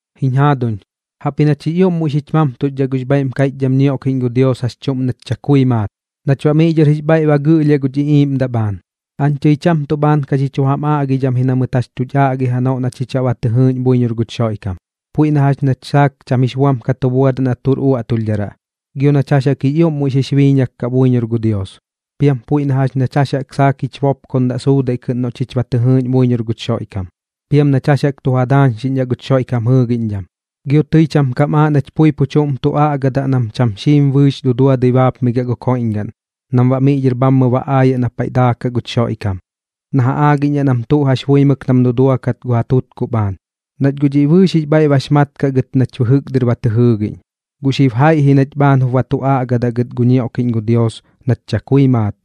Jiñ jaaduñ, jaꞌpji nach jix ioꞌm muiꞌ xich mamtuxdhaꞌ gux bhaiꞌm kaiꞌchdham ñioꞌkiꞌñ gu Dios jax chuꞌm nach chakui maat, nach baꞌ miꞌ dhɨr jix bhaiꞌ ba gɨꞌlhiaꞌ guch iꞌiiꞌmdaꞌ bhaan. Aañ tɨi cham tuꞌ bhaan ka xi chu jam aꞌgidham ji na mɨt jax tuch aꞌgi janoꞌ na chich baꞌ ba tɨ jɨɨꞌñ buiñor guch Xoiꞌkam, puiꞌ na jax nach saak cham jix buam ka tu buadaꞌ na tuꞌr uaꞌtulhdharaꞌ, gio nañ jax jaꞌk jix ioꞌm muiꞌ xix biiñak kaꞌ buiñor gu Dios. Piam puiꞌ na jax nach jax jaꞌk saak jich bopkondaꞌ suudaiꞌ kɨꞌn noꞌ chich ba tɨ jɨɨꞌñ buiñor guch Xoiꞌkam, piam nach jax jaꞌk tu ja daañxiꞌñdhaꞌ guch Xoiꞌkam jɨɨgiꞌñdham. Gio tɨi cham kam aaꞌ nach pui pu chuꞌm jup tu aꞌgadaꞌ nam cham xiim bɨɨx duduadɨi baapmigiaꞌ gu koiꞌñgaꞌn, nam baꞌ miꞌ dhɨr bhammɨ ba aayaꞌ na paiꞌ daakaꞌ guch Xoiꞌkam na ja aagiꞌñdhaꞌ nam tuꞌ jax buimɨk nam duduakat ja tutkuꞌ bhaan, nach guꞌ dhiꞌ bɨɨx jix bhaiꞌ bax mat kaꞌ gɨt nach bɨjɨk dɨr ba tɨ jɨɨgiꞌñ. Guꞌ xib jaiꞌ ji nach bhaan jup ba tu aꞌgadaꞌ gɨt gu ñioꞌkiꞌñ gu Dios nach chakui maat,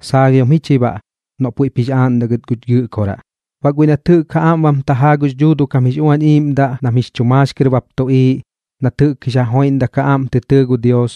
saalhiom ji chi baꞌ, noꞌ puiꞌp jix aaꞌndaꞌ gɨt guch Gɨꞌkoraꞌ. Baꞌ guiꞌ nat jɨꞌk ja aꞌm bam tajaa gux Dhuuduꞌ kam jix Uañ Iiꞌmdaꞌ nam jix chu maax kɨr bap tuꞌiiꞌ, nat jɨꞌk jix ja joiꞌndak ja aꞌm tɨ tɨɨ gu Dios,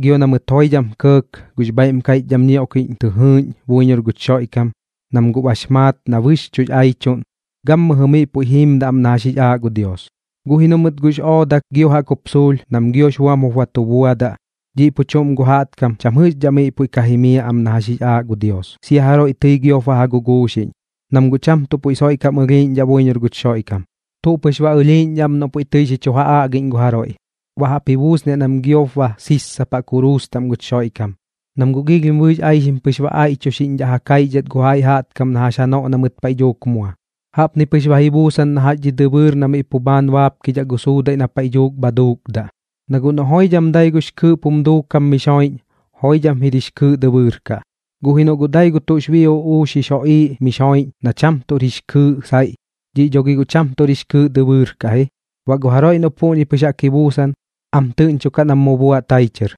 gio na mɨt joidham kɇɇk gux bhaiꞌm kaiꞌchdham ñioꞌkiꞌñ tɨ jɨɨꞌñ buiñor guch Xoiꞌkam, nam guꞌ bax maat na bɨxchuꞌx aichuꞌn, gammɨjɨ miꞌ puiꞌ jiimdaꞌ am na jax jix aa gu Dios. Guꞌ ji noꞌ mɨt guꞌx oodak gio jaꞌk jup suulh nam giox buam jup ba tu buadaꞌ, dhiꞌ pu chuꞌm gu jaꞌtkam cham jɨꞌxdhaꞌ miꞌ puiꞌ ka jimiaꞌ am na jax jix aaꞌ gu Dios, sia jaroiꞌ tɨi giop ba ja guguuxiꞌñ, nam guꞌ cham tuꞌ puiꞌ soiꞌ kam ɨlhiiꞌñdhaꞌ buiñor guch Xoiꞌkam. Tuꞌ pɨx ba ɨlhiiꞌñdhaꞌ am noꞌ puiꞌ tɨi xi chu ja aꞌgiꞌñ gu jaroiꞌ, baꞌ jaꞌp ji buusniaꞌ nam giop ba sissapaꞌ kuruus taꞌm guch Xoiꞌkam, nam guꞌ giilhim bɨɨx aixim pɨx ba aiꞌchuxiꞌñdhaꞌ ja kaixdhat gu jaiꞌ jaꞌtkam na jax janoꞌ na mɨt paiꞌ dhuuk mua. Jaꞌpni pɨx ba ji buusan na jax dhi dɨbɨɨr na miꞌ pu bhaan baapkidhaꞌ gu suudaiꞌ na paiꞌ dhuuk bha duukdaꞌ. Na guꞌ noꞌ joidham dai gux kɨɨꞌp jum duukam mix joiꞌñ, joidham jir jix kɨɨꞌ dɨbɨɨr kaꞌ. Guꞌ ji noꞌ guꞌ dai gu tuꞌx bii uꞌuux jix joꞌiiꞌ mix joiꞌñ na cham tuꞌr jix kɨɨꞌ saiꞌ, dhiꞌ dho gi guꞌ cham tuꞌx kɨɨꞌ dɨbɨɨr kaꞌ ji. Baꞌ gu jaroiꞌ noꞌ puꞌñi pɨx jaꞌk ji buusan, am tɨꞌñchokaꞌ nam mu buaꞌ tai chɨr.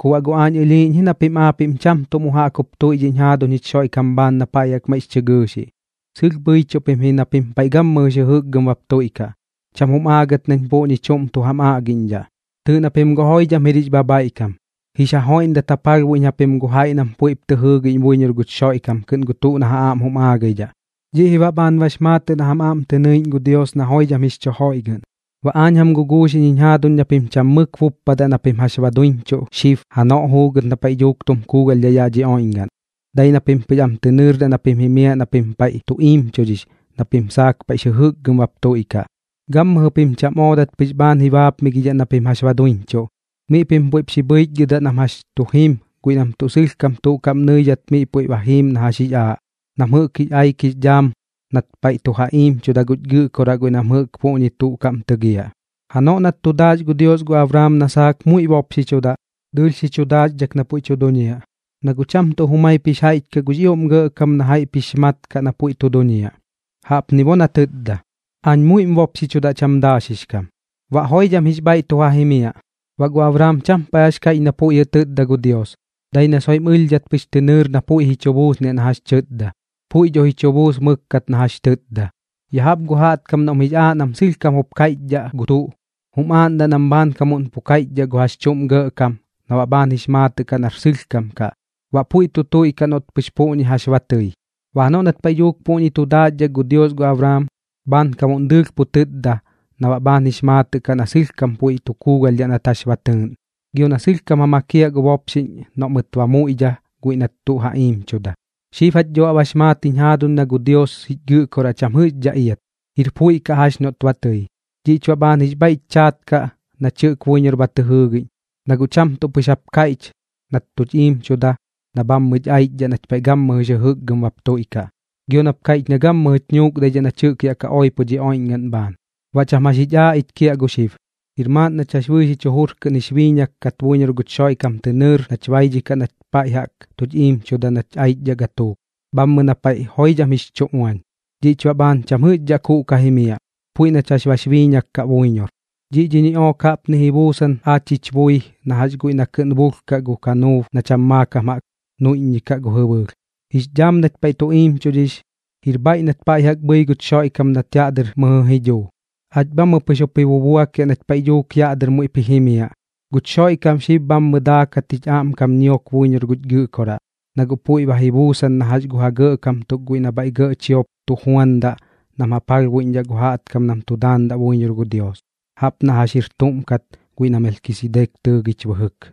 Ku baꞌ guꞌ aañ ɨlhiiꞌñ ji na pim aapiꞌm cham tuꞌ mu jaꞌk jup tuiꞌdhiꞌñ jaaduñ jich Xoiꞌkam bhaan na paiꞌ jaꞌk maiꞌx chɨ gɨɨxiꞌ. Sɨlh bhɨichuꞌ pim ji na pim paiꞌ gammɨjɨx jɨjɨkgɨm bap tuiꞌkaꞌ, cham jum aagat nañ puꞌñi chuꞌm tu jam aꞌgiꞌñdhaꞌ. Tɨɨꞌ na pim guꞌ joidham jir jix bhabhaiꞌkam, jix ja joiꞌndat ja palhbuiꞌñ japim gu jaiꞌ nam puiꞌp tɨ jɨɨgiꞌñ buiñor guch Xoiꞌkam kɨꞌn gu tuꞌ na ja aꞌm jum aagaidhaꞌ. Dhiꞌ ji baꞌ bhaan bax maatɨꞌ na jam aꞌm tɨ nɨiꞌñ gu Dios na joidham jix chu joiꞌgɨꞌn. Baꞌ aañ jam guguuxiꞌñ jiñ jaaduñ na pim cham mɨk buppadaꞌ na pim jax ba duiñchuꞌ xib janoꞌ juugɨt na paiꞌ dhuuk tum kuugalhdhaꞌ yaꞌ dhi oiꞌñgaꞌn. Dai na pim pɨx am tɨ nɨɨrdaꞌ na pim jimiaꞌ na pim paiꞌ tu iimchudhix na pim saak paiꞌx jɨjɨkgɨm bap tuiꞌkaꞌ. Gammɨjɨ pim cham oodat pɨx bhaan ji baapmigidhaꞌ na pim jax ba duiñchuꞌ, miꞌ pim puiꞌp xi bhɨichgɨdaꞌ nam jax tu jim guiꞌ nam tuꞌ sɨlhkam tuꞌ kaꞌm nɨidhat gu Dios miꞌ puiꞌ ba jiim na jax jix aaꞌ, nam jɨꞌk jix aik jix dhaam nat paiꞌ tu ja iimchuda guch Gɨꞌkoraꞌ guiꞌ nam jɨꞌk puꞌñi tuꞌ kaꞌm tɨgiaꞌ. Janoꞌ nat tu daax gu Dios gu Abraam na saak muiꞌ bopxichudaꞌ, dɨɨlh xi chum daaxdhak na puiꞌ tu duñiaꞌ, na guꞌ cham tuꞌ jumaip jix jaiꞌch kaꞌ gux ioꞌm gɇꞌkam na jaiꞌp jix mat kaꞌ na puiꞌ tu duñiaꞌ. Jaꞌpni bo na tɨtda: “Aañ muiꞌm bopxichudaꞌ cham daaxix kam. Baꞌ joidham jix bhaiꞌ tu ja jimiaꞌ.” Baꞌ gu Abraam cham paiꞌ jax kaiꞌch na puiꞌ jɨꞌ tɨtda gu Dios, dai na soiꞌm ɨlhdhat pɨx tɨ nɨɨr na puiꞌ ji chu buusniaꞌ na jax tɨtda. Puiꞌ dho ji chu buus mɨkkat na jax tɨtda. Ya jaꞌp gu jaꞌtkam noꞌm jix aaꞌ nam sɨlhkam jup kaiꞌchdhaꞌ gu tuꞌ, jum aaꞌndaꞌ nam bhaankamuꞌn pu kaiꞌchdhaꞌ gu jax chuꞌm gɇꞌkam na baꞌ bhaan jix maatɨꞌ kaꞌ nar sɨlhkam kaꞌ, baꞌ puiꞌ tu tuiꞌkaꞌ noꞌt pɨx puꞌñi jax ba tɨi. Baꞌ janoꞌ nat paiꞌ dhuuk puꞌñi tu daaxdhak gu Dios gu Abraam, bhaankamuꞌn dɨɨlh pu tɨtda na baꞌ bhaan jix maatɨꞌ kaꞌ na sɨlhkam puiꞌ tu kuugalhdhaꞌ nat jax ba tɨɨꞌn, gio na sɨlhkam ja makiaꞌ gu bopxiꞌñ noꞌ mɨt ba muiꞌdha guiꞌ nat tuꞌ ba ja iimchuda. Xib jach dho baꞌ bax maat jiñ jaaduñ na gu Dios jich Gɨꞌkoraꞌ cham jɨꞌxdhaꞌ iat, jir puiꞌ kaꞌ jax noꞌt ba tɨi. Dhiꞌch baꞌ bhaan jix bhaiꞌch chaat kaꞌ nach jɨꞌk buiñor ba tɨ jɨɨgiꞌñ, na guꞌ cham tuꞌ pɨx jap kaiꞌch nat tuch iimchuda na bhammɨch aichdhaꞌ nach paiꞌ gammɨjɨx jɨjɨkgɨm bap tuiꞌkaꞌ, gio nap kaiꞌch na gammɨjɨch nuukdaidhaꞌ nach jɨꞌk yaꞌ ka oipo dhi oiꞌñgaꞌn bhaan. Baꞌ cham jax jich aaꞌ ich kiaꞌ gu xib, jir maaꞌn nach jax bɨɨx jich jujur kɨꞌn jix biiñak kat buiñor guch Xoiꞌkam tɨ nɨɨr nach baidhikaꞌ nat paiꞌ jaꞌk tuch iimchuda nach aichdhaꞌ gatuuk, bhammɨ na paiꞌ joidham jix chu uañ. Dhiꞌch baꞌ bhaan cham jɨꞌxdhaꞌ kuuꞌ ka jimiaꞌ, puiꞌ nach jax bax biiñak kaꞌ buiñor. Dhiꞌ dhi ñiꞌook jaꞌpni ji buusan aach jich bui na jax guiꞌ na kɨꞌn bulhkaꞌ gu kanuub na cham maakam jaꞌk nuiꞌññikaꞌ gu jɨbɨɨlh. Jix dhaam nach paiꞌ tu iimchudhix, jir bhaiꞌ nat paiꞌ jaꞌk bhɨi guch Xoiꞌkam nat yaꞌ dɨr mɨjɨ ji dhuu. Aach bhammɨ pɨx jup ji bubuakiaꞌ nach paiꞌ dhuuk yaꞌ dɨr muiꞌp ji jimiaꞌ. Guch Xoiꞌkam xib bhammɨ daakat jich aꞌmkam ñiok buiñor guch Gɨꞌkoraꞌ, na guꞌ puiꞌ ba ji buusan na jax gu ja gɇꞌkam tuk guiꞌ nam bhaiꞌ gɇꞌ chiop tu juandaꞌ nam ja palhbuiꞌñdhaꞌ gu jaꞌtkam nam tu daandaꞌ buiñor gu Dios, jaꞌp na jax jir tuꞌm kat guiꞌ na Melkisidek tɨɨgich bɨjɨk.